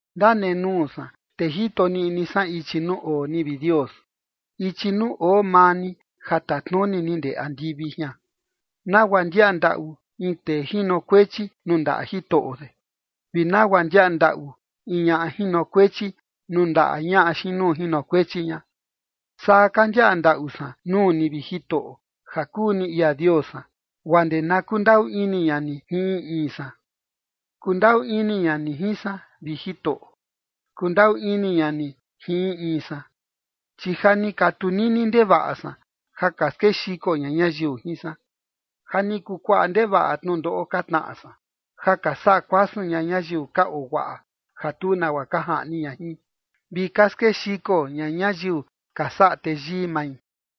Ndanenuu san te jito niꞌni san ichi nuu oo ni, vi Dios, ichi nuu oo maa ni ja tatnuni ni ndee andivi jian. Nagua ndiaꞌa ndaꞌu in tee jinokuechi nuu ndaꞌa jitoꞌo de, vi nagua ndiaꞌa ndaꞌu in ñaꞌa jinokuechi nuu ndaꞌa ñaꞌa xiin nuu jinokuechi ña, Saa ka ndiaꞌa ndaꞌu san nuu ni, vi Jitoꞌo, ja kuu ni ia Dios san, guaa ndee na kundaꞌu ini ña ni jin in in san. Kundaꞌu ini ña ni jin san, vi Jitoꞌo. Kundaꞌu ini ña ni jin in in san, chi ja ni ka tunini ndevaꞌa san ja ka skexiko ña ñayiu jin san. Ja ni kuu kuaꞌa ndevaꞌa tnundoꞌo ka tnaꞌa san, ja ka saꞌa kuasun ña ñayiu ka oo guaꞌa ja tu nagua ka jaꞌni ña jin, vi ka skexiko ña ñayiu ka saꞌa teyii mai.